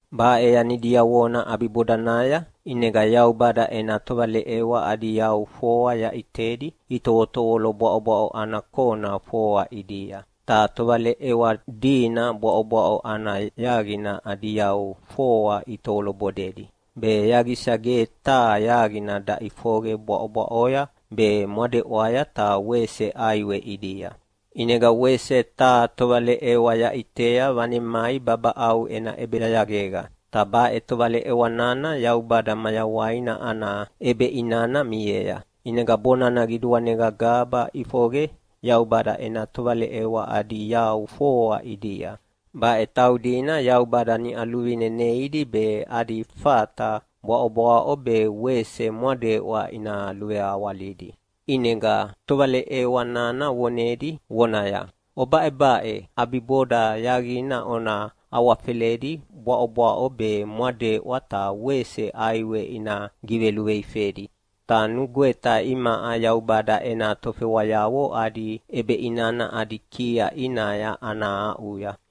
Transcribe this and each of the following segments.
Baʼe yani diavona ʼabibodanaya, ʼinega Yaubada ena tovaleʼewa adi yau foa yaʼitedi itovotovolo bwaʼobwaʼo ana kona foa ʼidia. Ta tovaleʼewa dina bwaʼobwaʼo ana yaqina adi yau foa itovolo bodedi, be yaqisa ge taha yaqina daʼifoqe bwaʼobwaʼoya be mwadeʼwaya ta wese ʼaiwe ʼidia. ʼInega wese taha tovaleʼewa yaʼitea vanemai babaʼau ena ʼebeyayaqega. Ta baʼe tovaleʼewa nana Yaubada mayawaina ana ʼebeʼinana miea. ʼInega bonana qiduanega gaba ʼifoqe Yaubada ena tovaleʼewa adi yau foa ʼidia. Baʼe taudina Yaubada niʼa luvine neidi be adi fata bwaʼobwaʼo be wese mwadeʼwa ina luveawalidi. ʼInega tovaleʼewa nana vonedi vonaya, “Obaʼebaʼe! ʼAbiboda yaqina ona awafeledi bwaʼobwaʼo be mwadeʼwa ta wese ʼaiwe ina giveluveifedi, ta nugweta imaʼa Yaubada ena tofewayavo adi ʼebeʼinana adi kia ʼinaya ana aʼuya.”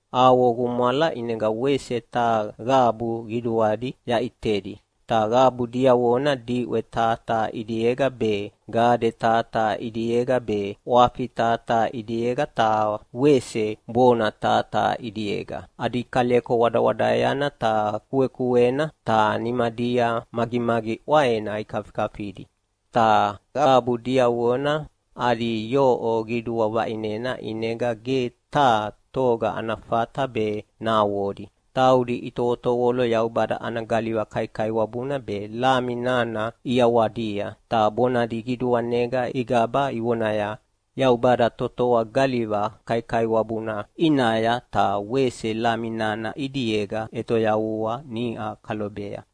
Avo gumwala ʼinega wese taha qabu qiduadi yaʼitedi. Ta qabu diavona diʼwe taha taha ʼidiega be, gade taha taha ʼidiega be, ʼwafi taha taha ʼidiega ta wese bona taha taha ʼidiega. Adi kaleko wadawadaeana ta kuekuena, ta nimadia magimagi ʼwaena ikafikafia. Ta qabu diavona adi yoʼo qidua vaʼinena ʼinega ge taha toga ana fata be nahavodi. Taudi itovotovolo Yaubada ana galiva kaikaiwabuna be Lami nana ʼiawadia, ta bonadi qiduanega igaba ivonaya, “Yaubada totoa galiva kaikaiwabuna ʼinaya ta wese Lami nana ʼidiega ʼetoyavua niʼa kalobea!”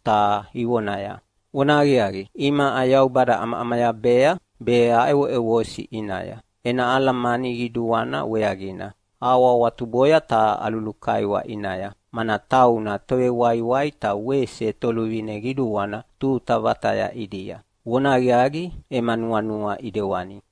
ta ivonaya, “Vonahaqiaqi, imaʼa Yaubada aʼamaʼamayabea be aʼevoʼevosi ʼinaya ena alamani qiduana weaqina. Ahawahawatuboya ta alulukaiwa ʼinaya, mana tauna Tovewaiwai ta wese Toluvine Qiduana tuta vataya ʼidia. Vonahaqiaqi, ema nuanua ʼidewani.”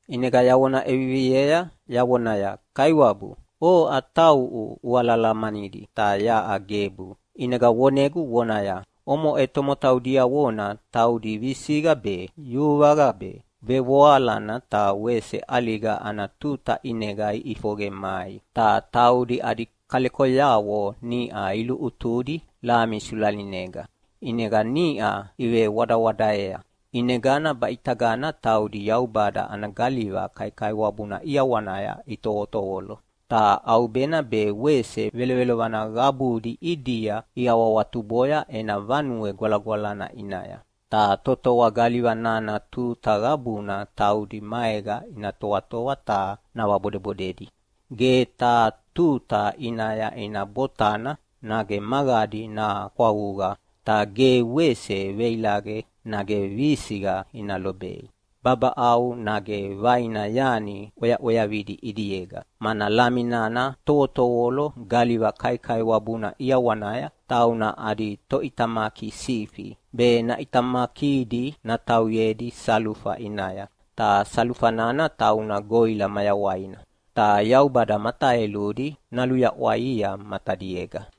ʼInega yavona ʼeviviea yavonaya, “Kaiwabu, oʼa tauʼu ualahalamanidi, ta yaʼa gebu.” ʼInega vonegu vonaya, “Omoʼe tomotau diavona taudi visiqa be, yuvaqa be, vevoalana ta wese ʼaliga ana tuta ʼinega iʼifoqe mai. Ta taudi adi kalekoyavo niʼa iluʼutudi Lami sulalinega, ʼinega niʼa ivewadawadaeya. ʼInegana, baʼitagana taudi Yaubada ana galiva kaikaiwabuna ʼiawanaya itovotovolo, ta ʼaubena be wese velovelovana qabuna ʼidia iawahawatuboya ena Vanue Gwalagwalana ʼinaya. Ta totoa galiva nana tuta qabuna taudi maega ina toatoa ta navabodebodedi. Ge taha tuta ʼinaya ina botana nage magadi nakwavuqa, ta ge wese veilaqe nage visiqa ina lobei babaʼau nage vaina yani ʼweaʼweavidi ʼidiega. Mana Lami nana tovotovolo galiva kaikaiwabuna ʼiawanaya tauna adi toʼitamaki sifi, be naʼitamakidi natauyedi salufa ʼinaya, ta salufa nana tauna goʼila mayawaina. Ta Yaubada mataeludi naluyaʼwaia matadiega.”